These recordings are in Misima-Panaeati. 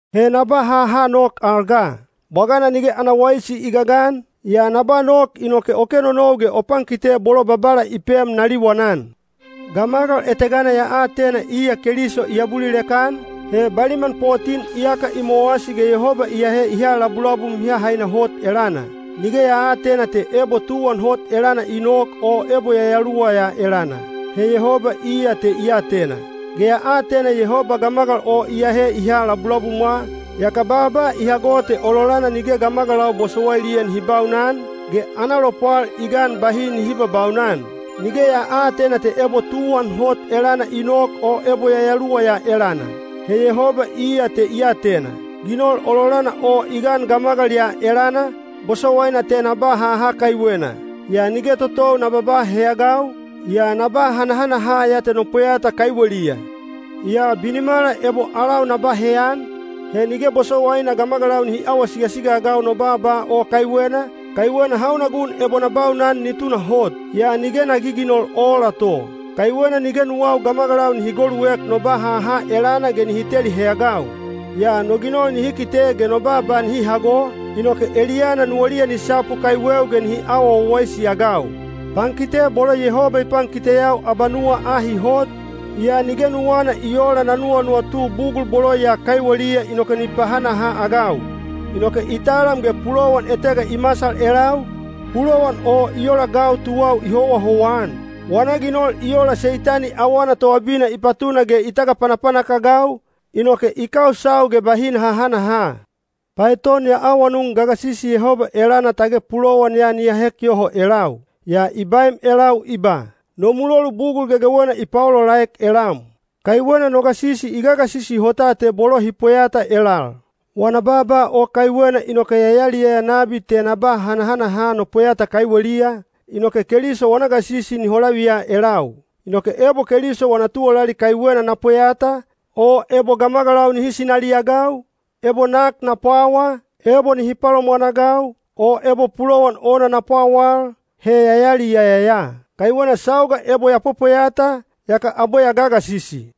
He na ba haha nok al ga. Bwagana nige ana waisi i gagan, yaa na ba nok inoke o kenonou ge o pankite bolo Babala i pem na liwanan. Gamagal etegana ya atena iya Keliso i abulilek-an, he baliman potin iyaka i mowasi ge Yehoba i ahe i ha labulabum mihamihaina hot elana. (Nige ya aatena te ebo tuwan hot elana i nok o ebo yayaluwa ya elana. He Yehoba iya te i atena.) Ge ya atena Yehoba gamagal o i ahe i ha labulabumwa, yaka baaba i hago te ololana nige gamagalau bosowailiya nihi baunan, ge ana lopwal i gan bahi nihi babaunan. (Nige ya aatena te ebo tuwan hot elana i nok o ebo yayaluwa ya elana. He Yehoba iya te i atena.) Ginol ololana o i gan gamagal ya elana, bosowaina te na ba haha kaiwena. Yaa nige totou na babaa heyagau, yaa na ba hanahanaha ya te no pweyata kaiweliya. Yaa binimala ebo alau na ba heyan, he nige bosowaina gamagalau nihi awa sigasiga-agau no baaba o kaiwena, kaiwena hauna gun ebo na baunan ni tunahot. Yaa nige na giginol oola to. Kaiwena nige nuwau gamagalau nihi goluek no ba haha elana ge nihi teli heyagau. Yaa no ginol nihi kite ge no baaba nihi hago, inoke eliyana nuwaliya ni sapu kaiweu ge nihi awa wawaisi-agau. Pankite bolo Yehoba i pankiteyau abanuwa ahi hot, yaa nige nuwana i oola na nuwanuwatu bugul bolo ya kaiweliya inoke ni pahanaha-agau. Inoke i talam ge pulowan etega i masal elau, pulowan o i ola gau tuwau i howahowa-an. Wana ginol i ola Seitani awana toabina i patuna ge i tagapanapanak-agau, inoke i kausau ge bahi na hahanaha. Paeton ya awanun gagasisi Yehoba elana tage pulowan ya ni ahek yoho elau. Yaa i baem elau i ba, “No mulolu bugul gegewena i paolaolaek elam. Kaiwena no gasisi i gagasisi hota te bolo hi pweyata elal.” Wana baaba o kaiwena inoke ya yaliyaya nabi te na ba hanahanaha no pweyata kaiweliya, inoke Keliso wana gasisi ni holaviya elau. Inoke ebo Keliso wana tuwalali kaiwena na pweyata, o ebo gamagalau nihi sinaliagau, ebo nak na pwawa, ebo nihi palomwanagau, o ebo pulowan ona na pwawal, he ya yaliyaya ya. Kaiwena sauga ebo ya pwepweyata, yaka abwe ya gagasisi.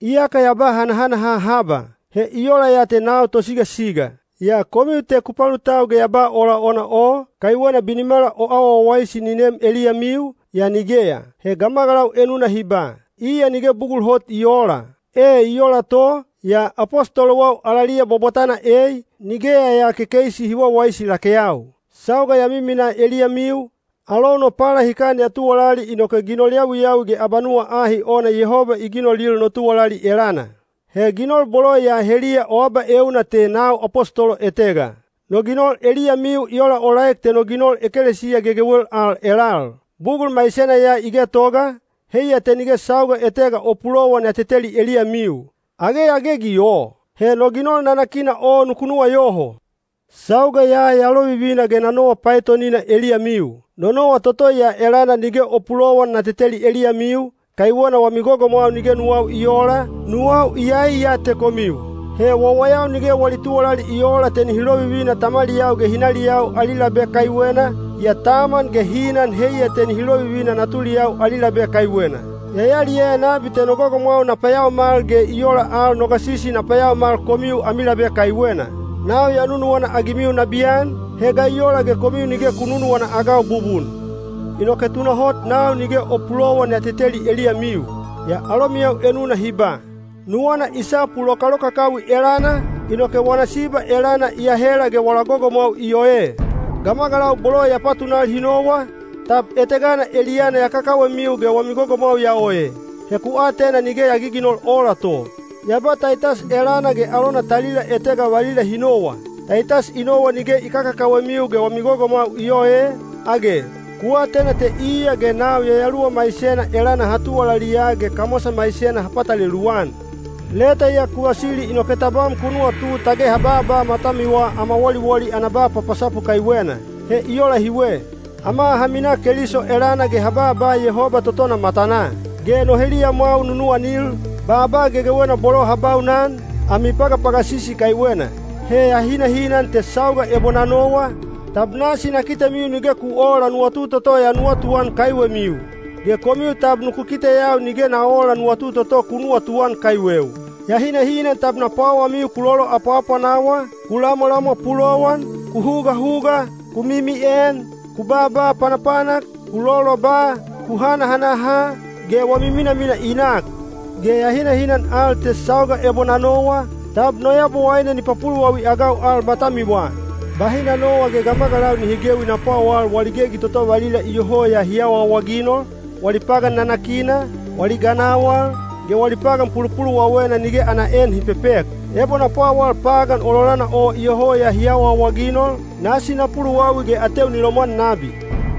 Iyaka ya ba hanahanaha haba, he i ola ya te nau tosigasiga! Yaa komiu te ku palutau ge ya ba ola ona o, kaiwena binimala o awa wawaisi ni neem eliyamiu, yaa nigeya. He gamagalau enuna hi ba, “Iya nige bugul hot i oola.” E i ola to, yaa apostolowau alaliya bwabwatana ei, nigeya ya kekeisi hi wawaisi lakeyau. Sauga ya miminaa eliyamiu, alou no palahikan ya tuwalali inoke ginol yawiyawi ge abanuwa ahi ona Yehoba i ginolil no tuwalali elana. He ginol bolo ya heliya o abaeuna te nau apostolo etega. No ginol eliyamiu i olaolaek te no ginol ekelesiya gegewel al elal. Bugul maisena ya i getoga, heiya te nige sauga etega o pulowan ya teteli eliyamiu. Age ya gegi o? He no ginol nanakina o nuku nuwayoho! Sauga ya ya lovivina ge na nowa paetonina eliyamiu. No nowa toto ya elana nige o pulowan na teteli eliyamiu, kaiwena wami gogomwau nige nuwau i oola, nuwau iyai ya te komiu. He wawayau nige wali tuwalali i oola te nihi lovivina tamaliyau ge hinaliyau ali labe kaiwena, yaa taman ge hinan heiya te nihi lovivina natuliyau ali labe kaiwena. Ya yaliyaya nabi te no gogomwau na payaomal ge i ola al no gasisi na payaomal komiu ami labe kaiwena. Nau ya nunuwana-agimiu nabiyan, he ga i ola ge komiu nige ku nunuwana-agau bubun? Inoke tunahot nau nige o pulowan ya teteli eliyamiu. Yaa alomiyau enuna hi ba, “Nuwana i sapu lokalokakawi elana, inoke wana siba elana i ahela ge wala gogomwau i oe.” Gamagalau bolo ya patunal hi nowa, tab etegana eliyana ya kakawemiu ge wami gogomwau ya oe? He ku atena nige ya giginol oola to. Ya ba Taitas elana ge alona talila etega valila hi nowa. Taitas i nowa nige i kakakawemiu ge wami gogomwau i ooe, age? Ku atena te iya ge nau yayaluwa maisena elana ha tuwalaliya ge kamwasa maisena ha patalelu-an. Leta ya ku vasili inoke tabam ku nuwatu tage ha baaba matamiwa ama woliwoli ana ba papasapu kaiwena. He i ola hiwe. Ama ha minaa Keliso elana ge ha baaba Yehoba totona matanaa. Ge no heliyamwau nunuwanil, baaba gegewena bolo ha baunan, ami pagapagasisi kaiwena. He ya hinahinan te sauga ebo na nowa, tab nasi na kitemiu nige ku oola nuwatu toto ya nuwatuan kaiwemiu. Ge komiu tab nuku kiteyau nige ya oola nuwatu toto ku nuwatuan kaiweu. Ya hinahinan tab na pwawamiu ku loloapwaapwanawa, ku lamwalamwa pulowan, ku hugahuga, ku mimien, ku baaba panapanak, ku loloba, ku hanahanaha, ge wami minamina i nak. Ge ya hinahinan al te sauga ebo na nowa, tab no Yabowaine ni papuluwawi-agau al matamiwa. Bahi na nowa ge gamagalau nihi gewi na pwawal wali gegi toto valila iyoho ya hi awaawaginol, wali pagan nanakina, wali ganawal, ge wali pagan pulupuluwawena nige ana en hi pepek. Ebo na pwawal pagan ololana o iyoho ya hi awaawaginol, nasi na puluwawi ge ateu ni lomwan nabi.